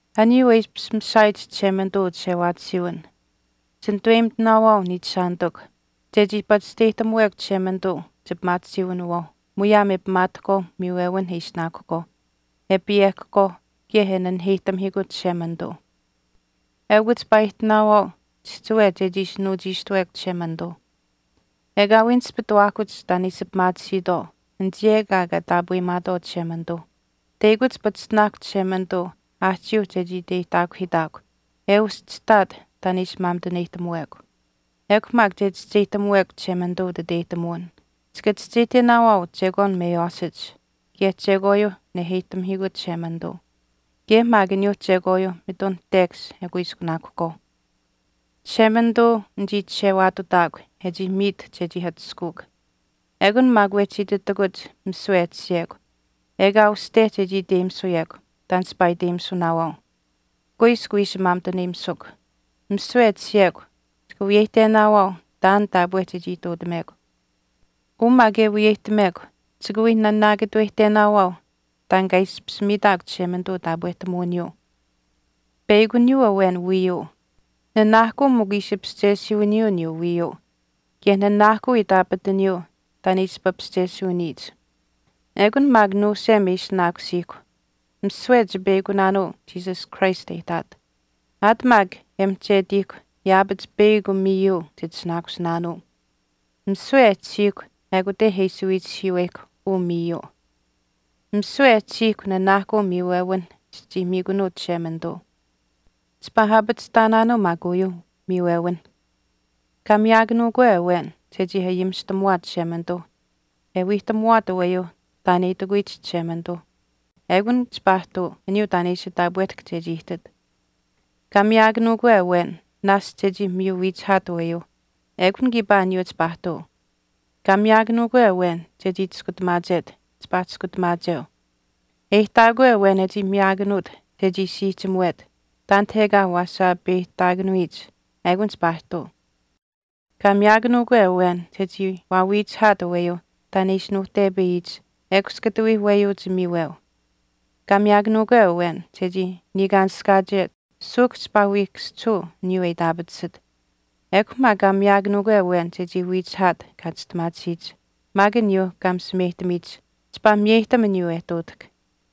Aniyuu e ishpish mishaayich Chishemanituu uchishewaatisiiwin, chinituweyimitinaawaau, niichishaanitikw, chechii pachishteyihtamuwekw Chishemanituu chipimaatisiiwinawaauh muyaam e pimaatahkwaauh miiwewinh e ishinaakuhkwaauh, e payehkahkwaau kaye e naheyihtamihiikut Chishemanituu. Eukw chipaa ihtinaawaau chihchiwe chechii ishi nuuchiishtuwekw Chishemanituu. Ekaawii nispituwaahkuch taan e ishi pimaatisiitwaau anichii ekaa kaa taapweyimaatwaau Chishemanituuh. Teyakuch pachishtinaakw Chishemanituu aahchiiuh chechii iteyihtaakuhiitaakw e uschihtaat taan e ishi maamituneyihtamuwekw. Ekw maak che chischeyihtamuwekw Chishemanituu utiteyihtamuwin, chika chischeyihtenaawaau chekwaan meywaashiyich kaye chekwaayuu neheyihtamihiikut Chishemanituu, kaye maak aniyuuh chekwaayuuh mitun tekash e kuiskunaakuhkwaauh. Chishemanituu nichii chishewaatutaakw e chii miit chechii atushkuukw. Ekun maak wehchi ititakuch misiwe e tashiyekw ekaa uste chechii iteyimisuyekw taan chipaa iteyimisunaawaau. Kuiskw wiishi maamituneyimisukw. Misiwe e tashiyekw chika wiyeyihtenaawaau taan taapwe chechii ihtuutamekw. Uu maak e wiyeyihtamekw chika wii nanaakatuweyihtenaawaau taan kaa ishpish miitaakw Chishemanituu taapwehtamuwiniyuu. Peyakuniyuu awen wiiyuu. Nanaahkuu mikw ishi paschesiiwiniyuu aniyuu wiiyuu. Kaye nanaahkuu itaapataniyuu taan e ishi papaschesiiwiniyich. Ekun maak nuusem e ishinaakusiihkw. Misiwe chipeyakunaanuu Jesus Christ e ihtaat. Aat maak e mihchetiihkw yaapach peyakw miiyuu chitishinaakusinaanuu. Misiwe maak e tashiihkw ekute e ishi wiichihiiweyihkw uu miiyuu. Misiwe e tashiihkw nanaahkuu miiwewinh chichii miikunuu Chishemanituu. Chipaa aapachihtaanaanuu maak uyuuh miiwewinh. Kaa miyaakanuukwe awen chechii ayimishtamuwaat Chishemanituuh e wiihtamuwaat aweyuuh taan e itikuwiyich Chishemanituu ekun chipaa ihtuu aniyuu taan e ishi taapwehtahk chechii ihtit. Kaa miyaakanuukwe awen naashch chechii miyu wiichihaat aweyuu ekun kiipaa aniyuu chipaa ihtuu. Kaa miyaakanuukwe awen chechii chiskutamaachet chipaa chiskutamaacheu. E ihtaakwe awen e chii miyaakanuut chechii siihchimuwet taanit ekaa waa saapeyihtaakanuyich ekun chipaa ihtuu. Kaa miyaakanuukwe awen chechii waawiihchihaat aweyuuh taan e ishi nuuhtepayiyich ekush kata wii weyuuch miiweu. Kaa miyaakanuukwe awen chechii niikaanishkaachet suuhk chipaa wii kaschihuu aniyuu e itaapatisit. Ekw maak kaa miyaakanuukwe awen chechii wiichihaat kaa chistimaatisiyich maak aniyuuh kaa misimeyihtamiyich chipaa miyeyihtam aniyuu e ihtuutahk.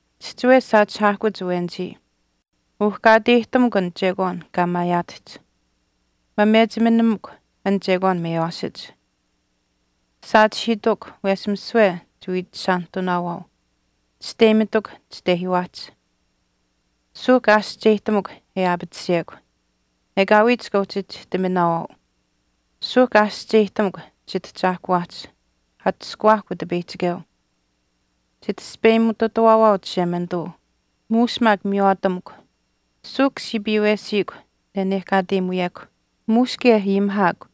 Chihchiwe saachihaahkuch awenichii. Uhkaateyihtamukw an chekwaan kaa maayaatahch. Mamechiminamakw an chekwaan meywaashich. Saachihiitukw wesh misiwe chiwiichishaanihtunaawaau. Chisteyimitukw chitehiiwaahch. Suuhk aashihcheyihtamukw e aapatisiyekw. Ekaawii chika uhchi chihtiminaawaau. Suuhk aashihcheyihtamukw chitahchaahkuwaahch. Atushkuwaahkw Utipeyihchikeu. Chitaspeyimututawaawaau Chishemanituu muush maak miywaatamukw. Suuhk siipiiwesikw nenehkaateyimuyekw. Muush kaye ayimihaakw.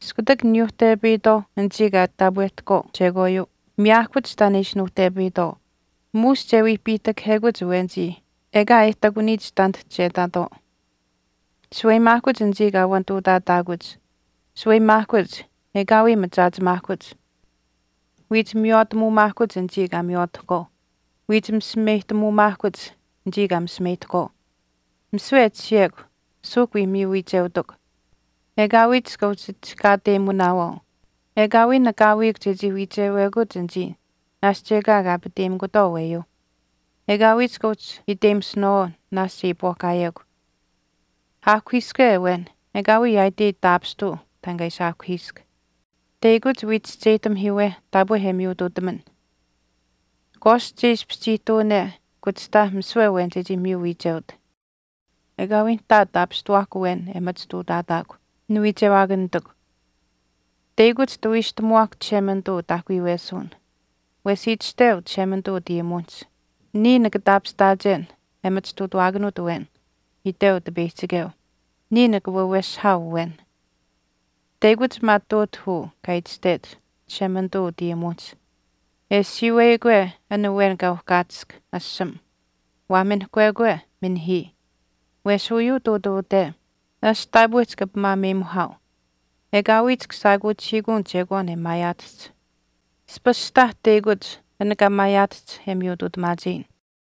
Iskutak niyuuhtepayitwaauh anichii kaa taapwehtahkwaau chekwaayuu miyaahkuch taan e ishi nuuhtepayitwaau. Muush che wii piihtakahekuch awenichii ekaa e ihtakuniyich taanit che ihtaatwaau. Shaweyimaahkuch anichii kaa wanituutaataahkuch. Shaweyimaahkuch, ekaawii machaachimaahkuch. Wiich miywaatamuumaahkuch anichii kaa miywaatahkwaau. Wiich misimeyihtamuumaahkuch anichii kaa misimeyihtahkwaau. Misiwe e tashiyekw suuhk wii miyu wiicheutukw. Ekaawii chika uhchi chihkaateyimunaawaau. Ekaawii nakaawiikw chechii wiichewekuch anichii naashch ekaa kaa aapateyimikutwaau aweyuuh. Ekaawii chika uhchi iteyimisunaawaau naashch e iipwaahkaayekw. Aahkuhiiske awen ekaawii yaaitei taapishtuu taan kaa ishi aahkuhiisk. Teyakuch wii chischeyihtamihiiwe taapwe e miyutuutaman. Kwaast che ishpish chii ihtuwane, kuchihtaa misiwe awen chechii miyu wiicheut. Ekaawii nihtaa taapishtuwaahkw awen e machituutaataakw, niwiichewaakanitikw. Teyakuch tawiishtamuwaahk Chishemanituu utaahkuyuwesuwin. Wesh itashteu Chishemanituu utayimuwinihch, Niya nika taapishtaachen e machituutawaakanuut awen, iteu Utipeyihchikeu. Niya nika waweshihaau awen. Teyakuch maa ihtuutah uu kaa itashtech Chishemanituu utayimuwinihch, E siiweyikwe an awen kaa uhkaatisk, ashamah. Waa minihkwekwe, minihii. Wesh uyuu ihtuutuute, naashch taapwe chika pimaameyimuhaau. Ekaawii chika shaakuuchihiikun chekwaan e maayaatahch. Aspashtaah teyakuch an kaa maayaatahch e miyutuutamaacheyin.